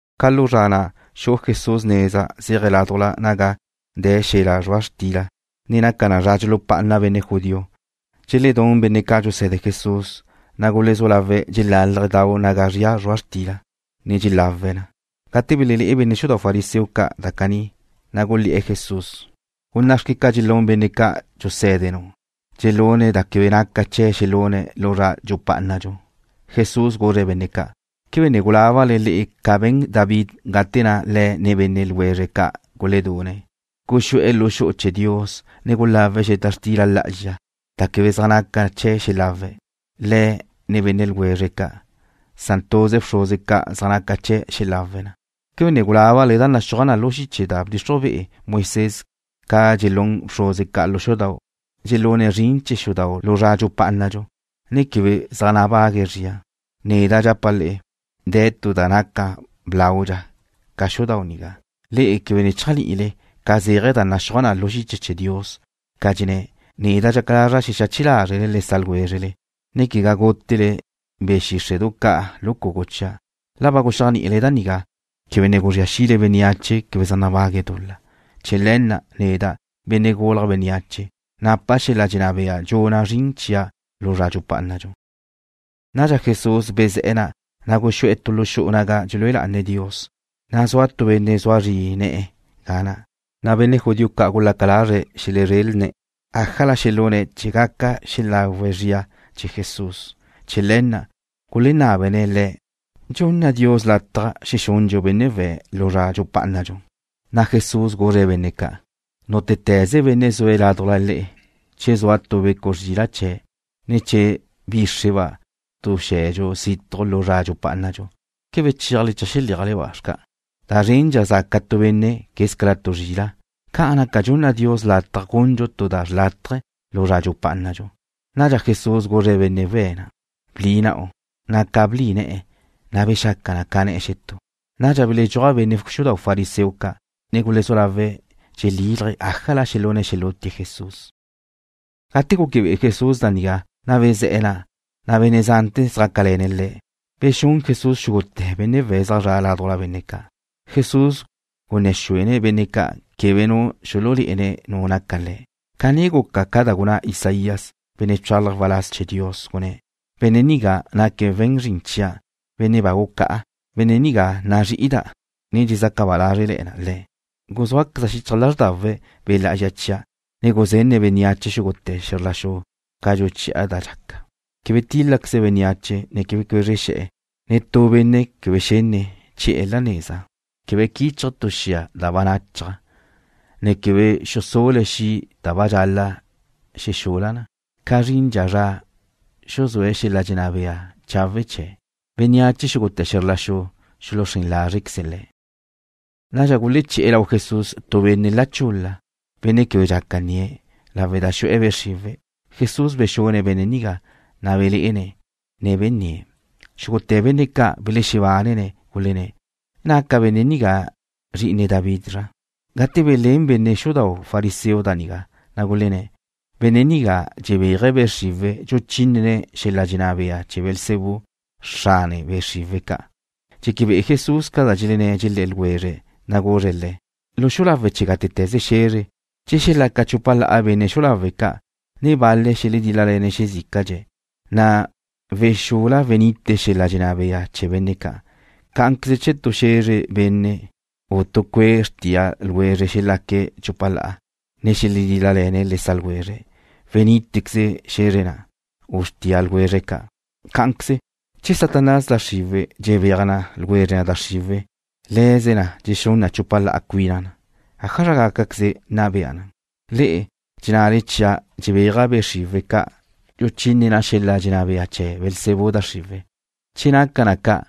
Ca lu zra na' xu'u Jesús neza zéaje̱' ládujla naga de̱ xel-la' zrua' xtila, ne naca zra dxulupá'ana benne' judío. Dxeledún benne' ca' dxuse̱de Jesús, na' gulezú lawe̱' dxelálaje̱' dau naga zria zrua' xtila, ne dxelawe̱' na. Gate belelé'e benne' xudau' fariseo ca' da caní, na' gulé̱'e̱ Jesús: ―Guná' xque ca dxelún benne' ca' dxusé̱denu', dxelune̱' zrin da quebe naca chee̱' xelune̱' lu zra dxupá'anadxu. Jesús guzre̱' benne' ca': ―¿Quebe ne gulábale le'e ca be̱n David gate na' le̱', ne benne' ljwezre̱' ca' guledune̱'? Guxú'e̱ lu xu'u chee̱ Dios, ne gulawe̱' xeta xtila lá'azxa, da quebe zaj naca chee̱' xelawe̱', le̱', ne benne' ljwezre̱' ca', san tuze bxruze ca' zaj naca chee̱' xelawe̱' na. ¿Quebe ne gulábale da naxúaj na lu da bdxixruj be'e Moisés ca dxelún bxruze ca' lu xudau', dxelune̱' zrin chee̱ xudau' lu zra dxupá'anadxu, ne quebe zaj nabague̱' zria? Neda' dxapa' le'e, de̱ tu da naca blaudxa ca xudau' nigá. ¿Quebe ne chéajni'ile ca zéaje̱ da naxúaj na lu xiche chee̱ Dios? Dxenná na: Neda' dxaca lazra' xexache lázrele le sa' ljwézrele, ne quegá gútele be̱ xíxre'du ca' lu cugu chia'. La ba guxéajni'ile da nigá, quebe ne guzría xile bénneache quebe zaj nabague̱' dul-la. Chee̱ le̱ na', neda', Benne' Gulje̱' Bénneache, napa' xel-la' dxenná bea dxuna' zrin chia' lu zra dxupá'anadxu. Nadxa Jesús bezé̱'e̱ na', na' guxú'e̱ tu lu xu'u naga dxelúe lá'ane̱' Dios. Zua tu benne' zua zri ne̱'e̱ ga na'. Benne' judío ca' gulaca lazre̱' xelezrelne̱' ájala xelune̱' chee̱ gaca xelagu zrie̱' chee̱ Jesús. Chee̱ le̱ na' gulenábene̱' Le̱': ―¿Dxunna Dios lataj xexundxu benne' we̱' lu zra dxupá'anadxu? Jesús guzre̱' benne' ca': ―Nútete̱ze benne' zue̱' ládujla le'e, che zua tu zrila' chee̱', ne che bíxreba' tu xe̱dxu situj lu zra dxupá'anadxu, ¿quebe chéaje̱' cheajxeléaje̱'-ba' xca'? Da zrendxa zaca tu benne' quez ca tu zrila'. Ca'an naca dxunna Dios lataj gundxu tu da xrlátaje lu zra dxupá'anadxu. Nadxa Jesús guzre̱' benne' we̱' na': ―Bli na'u. Ca blí ne̱'e̱, na' bexaca na ca ne̱'e̱ xetú. Nadxa beledxúaj benne' xudau' fariseo ca', ne gulezú lawe̱' dxelílaje̱' ájala xelune̱' xelútie̱' Jesús. Gate gúquebe'e Jesús da nigá, na' bezé̱'e̱ na', na' benne' zante̱ zjácale̱ne̱' Le̱'. Bexún Jesús xúgute̱ benne' we̱' zaj zre̱'e̱ ládujla benne' ca'. Jesús gunné̱ xúene̱' benne' ca' quebe nu xululé'ene̱' nu naca Le̱'. Caní guca ca da gunná Isaías, benne' bchálaje̱' waláz chee̱ Dios, gunné̱': Benne' nigá naque̱' we̱n zrin chia', benne' ba gucá'a. Benne' nigá nazrí'ida', ne dxezaca ba lázrele̱na' Le̱'. Guzúaqueza' xichaj lázrdawe̱' Be' Lá'azxa chia'. Guzenne̱' bénneache xúgute̱ xe̱zr la xu ca dxuchi'a da dxaca. Quebe tíl-lale̱queze̱' bénneache, ne quebe cuézrexe̱'e̱. Netú benne' quebe xenne̱' chi'e̱ la neza. Quebe quichje̱' tu xia da ba nachaj, ne quebe xusul-le̱' xi' da ba dxaca wexul-la na, ca zrindxa zra xuzúe̱' xel-la' dxenná bea chawe' chee̱'. Bénneache xúgute̱ xe̱zr la xu xuluxrén lázrequeze̱' Le̱'. Nadxa guleché̱'e̱ lau Jesús tu benne' la chul-la, benne' quebe dxaca nnie̱', lawe' da xu'e̱ be' xriwe̱'. Jesús bexune̱' benne' nigá, na' belé'ene̱', ne benníe̱'. Xúgute̱ benne' ca' belexebánene̱', gulenné̱': ―¿Naca benne' nigá Zri'ine David zra? Gate belén benne' xudau' fariseo da nigá, na' gulenné̱': ―Benne' nigá dxebéaje̱' be' xriwe̱', dxuchínene̱' xel-la' dxenná bea chee̱ Beelzebú, xrane be' xriwe̱' ca'. Dxeque be'e Jesús ca da dxelenné̱', dxelé̱'e̱ ljwezre̱', na' guzre̱' le̱': ―Lu xu'u lawe' chee̱ gátete̱ze xe̱zre, che xelaca chupa la'a benne' xu'u lawe' ca', ne bal-le̱' xeledíl-lale̱ne̱' xezícadxe̱', na' wexul-la wenite xel-la' dxenná bea chee̱ benne' ca'. Cá'anqueze che tu xe̱zre benne', u tu cue' xrtía ljwezre xelaque̱' chupa la'a, ne xeledíl-lale̱ne̱' le sa' ljwezre̱', wenítequeze xe̱zre na', u xrtía ljwezre ca'. Cá'anqueze, che Satanás, da xriwe̱', dxebéaje na ljwezre da xriwe̱', le̱ze na dxexún na chupa la'a cuina na. ¿Ájazra gácaqueze nna bea na? Le'e dxennale chia' dxebéaja' be' xriwe̱' ca', dxuchíneda' xel-la' dxenná bea chee̱ Beelzebú da xriwe̱'. Che naca na ca',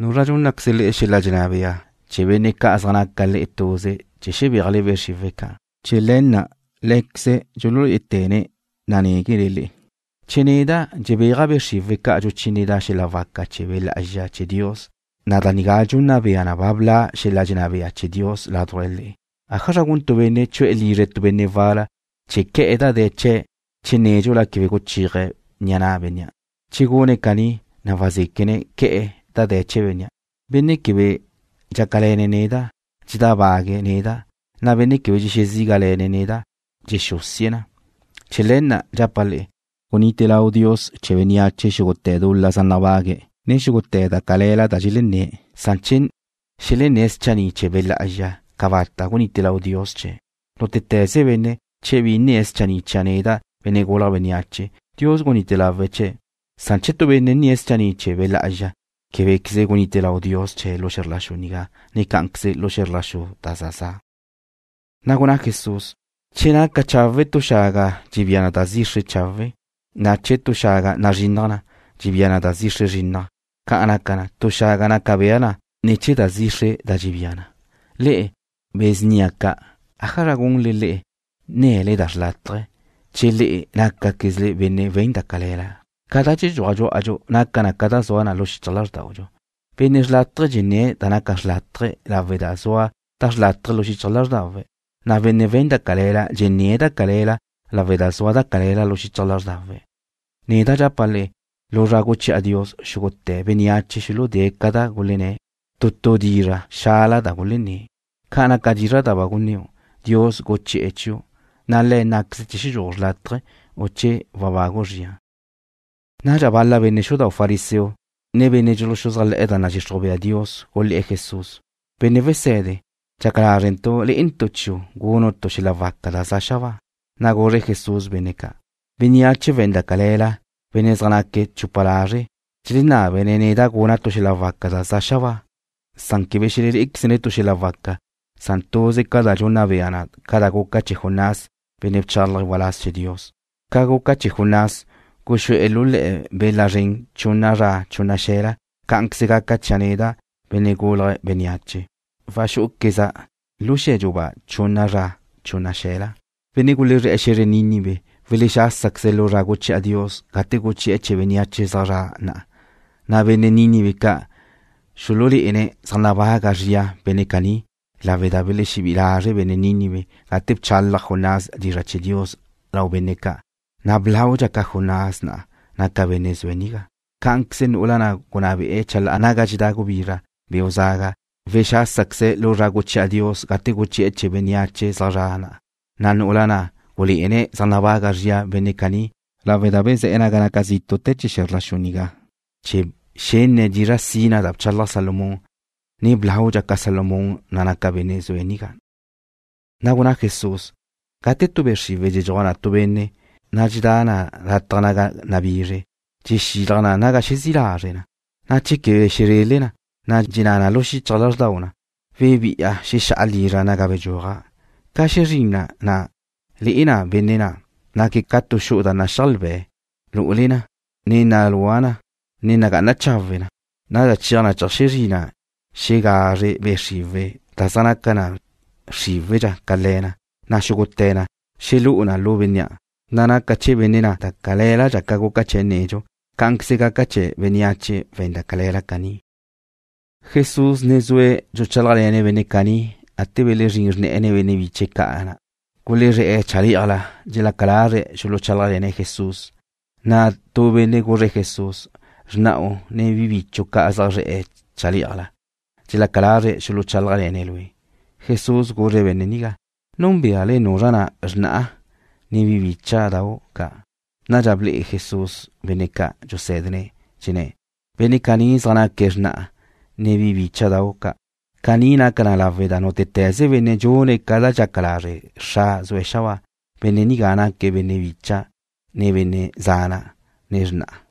¿Nuzra dxúnnaqueze xel-la' dxenná bea chee̱ benne' ca' zaj naca le'e tuze chee̱ xelebéaje̱' be' xriwe̱' ca'? Chee̱ le̱ na' lé̱queze̱' dxululé'ete̱ne̱' nanéguele le'e. Che neda' dxebéaja' be' xriwe̱' ca' dxuchíneda' xel-la' waca chee̱ Be' Lá'azxa chee̱ Dios, da nigá dxunna bea na ba bla' xel-la' dxenná bea chee̱ Dios ládujla le'e. ’¿Ájazra gun tu benne' chu'e̱ lizre tu benne' wal-la chee̱ que̱'e̱ da de̱ chee̱' che nédxula quebe guchéaje̱' ni'a na' bénnea'? Che gune̱' caní, na' wazéquene̱' que̱'e̱ da de̱ chee̱ bénnea'. ’Nu benne' quebe dxácale̱ne̱' neda', dxedábague̱' neda', na' benne' quebe dxexezígale̱ne̱' neda', dxexúsie̱' na. ’Chee̱ le̱ na' dxapa' le'e, gunite lau Dios chee̱ bénneache xúgute̱ dul-la zaj nabague̱', ne xúgute̱ da cale̱la da dxelenné̱', san che xelenné̱' schanni' chee̱ Be' Lá'azxa, cabata' gunite lau Dios chee̱'. Nútete̱ze benne', che bi nnie̱' schanní' chia' neda', Benne' Gulje̱' Bénneache, Dios gunite lawe̱' chee̱', san che tu benne' nnie̱' schanni' chee̱ Be' Lá'azxa, québequeze gunite lau Dios chee̱' lu xe̱zr la xu nigá ne cá'anqueze lu xe̱zr la xu da za za'. Na' gunná Jesús: ―Che naca chawe' tu xaga, dxebía na da zixre chawe', na' che naca tu xaga bize, dxebía na da zixre bize. Ca'an naca, tu xaga naca bea na ne̱ chee̱ da zixre da dxebía na. Le'e, be̱ snia ca'. ¿Ájazra gunle le'e nne̱le da xrlátaje che le'e nácaquezle benne' we̱n da cale̱la xca'? Ca da dxedxuaj dxú'adxu naca na ca da zua na lu xichaj lázrdaudxu. Benne' xrlátaje dxenné̱' da naca xrlátaje lawe' da zua da xrlátaje lu xichaj lázrdawe̱', na' benne' we̱n da cale̱la dxenné̱' da cale̱la lawe' da zua da cale̱la lu xichaj lázrdawe̱'. Neda' dxapa' le'e, lu zra guchi'a Dios, xúgute̱ bénneache xuludée̱' ca da gulenné̱', tu tu dizra' xala da gulenné̱'. Ca naca dizra' da ba gunníu', Dios guchi'e̱ chiu', na' Le̱' nnáqueze̱' che xedxúaju' xrlátaje, u che webagu' zria. Nadxa bal-la benne' xudau' fariseo, ne benne' dxuluxuzájle̱'e̱ da nadxixruj bea Dios gulé̱'e̱ Jesús: ―Benne' Wese̱de, dxaca lázrentu' le'entu' chiu' gunu' tu xel-la' waca da za xabáa. Na' guzre Jesús benne' ca': ―Bénneache we̱n da cale̱la, benne' zaj naque̱' chupa lazre', dxelenábene̱' neda' guna' tu xel-la' waca da za xabáa. Quebe xelelé'equezne̱' tu xel-la' waca, san tuze ca da dxunna bea na ca da guca chee̱ Jonás, benne' bchálaje̱' waláz chee̱ Dios. Ca guca chee̱ Jonás, guxú'e̱ lu le̱'e̱ bela zren chunna zra chunna xe̱la, cá'anqueze gaca chia' neda', Benne' Gulje̱' Bénneache, waxú'uqueza' lu xe̱dxu ba chunna zra chunna xe̱la. Benne' gulezré̱'e̱ xe̱zre Nínive welexásaqueze̱' lu zra guchi'a Dios gate guchi'e̱ chee̱ bénneache zaj zre̱'e̱ na'a, na' benne' Nínive ca' xululé'ene̱' zaj nabaga zria benne' caní lawe' da belexebí'i lazre' benne' Nínive gate na' bchalaj Jonás dizra' chee̱ Dios lau benne' ca', na' blaudxa ca Jonás na' naca Benne' zue̱' nigá. Cá'anqueze nu'ula na' gunná be'e̱ chalá'a naga dxedá gubizra beu' zaga ca' wexásaqueze̱' lu zra guchi'a Dios gate guchi'e̱ chee̱ bénneache zaj zre̱'e̱ na'a, na' nu'ula na' gulé'ene̱' zaj nabaga zria benne' caní lawe' da bezé̱'e̱ naga naca zítu'te̱ chee̱ xe̱zr la xu nigá chee̱ xenne̱' dizra' sina da bchalaj Salomón, na' blaudxa ca Salomón na' naca Benne' zue̱' nigá. Na' gunná Jesús: ―Gate tu be' xriwe̱' dxedxuaj na tu benne', na' dxedá na lataj naga nabizre, dxexilaj na naga xezí' lazre' na, na' che quebe xezrele na, na' dxenná na lu xichaj lázrdau na: “Webi'a xexá'a lizra' naga bedxúaja'.” Ca xezrín na, le'e na benne' na', naque̱' ca tu xu'u da naxíajlbe̱ lu'ule na, ne nalúa na, ne nagá'ana chawe na. Nadxa cheaj na cheajxezrí na xegazre be' xriwe̱' da zaj naca na xríwe̱dxa ca le̱ na, na' xúgute̱ na dxelú'u na lu bénnea', na' naca chee̱ benne' na' da calé̱ladxa ca guca chee̱' nedxu. Cá'anqueze gaca chee̱ bénneache we̱n da cale̱la caní. Jesús ne zue̱' dxuchálajle̱ne̱' benne' caní gate belezrín xrne̱'e̱ ne benne' biche̱' ca' ga na'. Gulezré̱'e̱ chalé'ajla, ne dxelaca lazre̱' xuluchálajle̱ne̱' Jesús. Nadxa tu benne' guzre̱' Jesús: ―Xrna'u, ne bi bichu' ca' zaj zre̱'e̱ chalé'ajla. Dxelaca lazre̱' xuluchálajle̱ne̱' Lue'. Jesús guzre̱' benne' nigá: ―¿Núnbeale nuzra na' xrna'a, ne bi bícha'dau' ca'? Nadxa ble'e Jesús benne' ca' dxusé̱dene̱', dxenné̱': ―Benne' caní zaj naque̱' xrna'a, ne bi bícha'dau' ca'. Caní naca na lawe' da nútete̱ze benne' dxune̱' ca da dxaca lazre' Xra' zue̱' xabáa, benne' nigá naque̱' benne' bicha', ne benne' zana', ne xrna'a.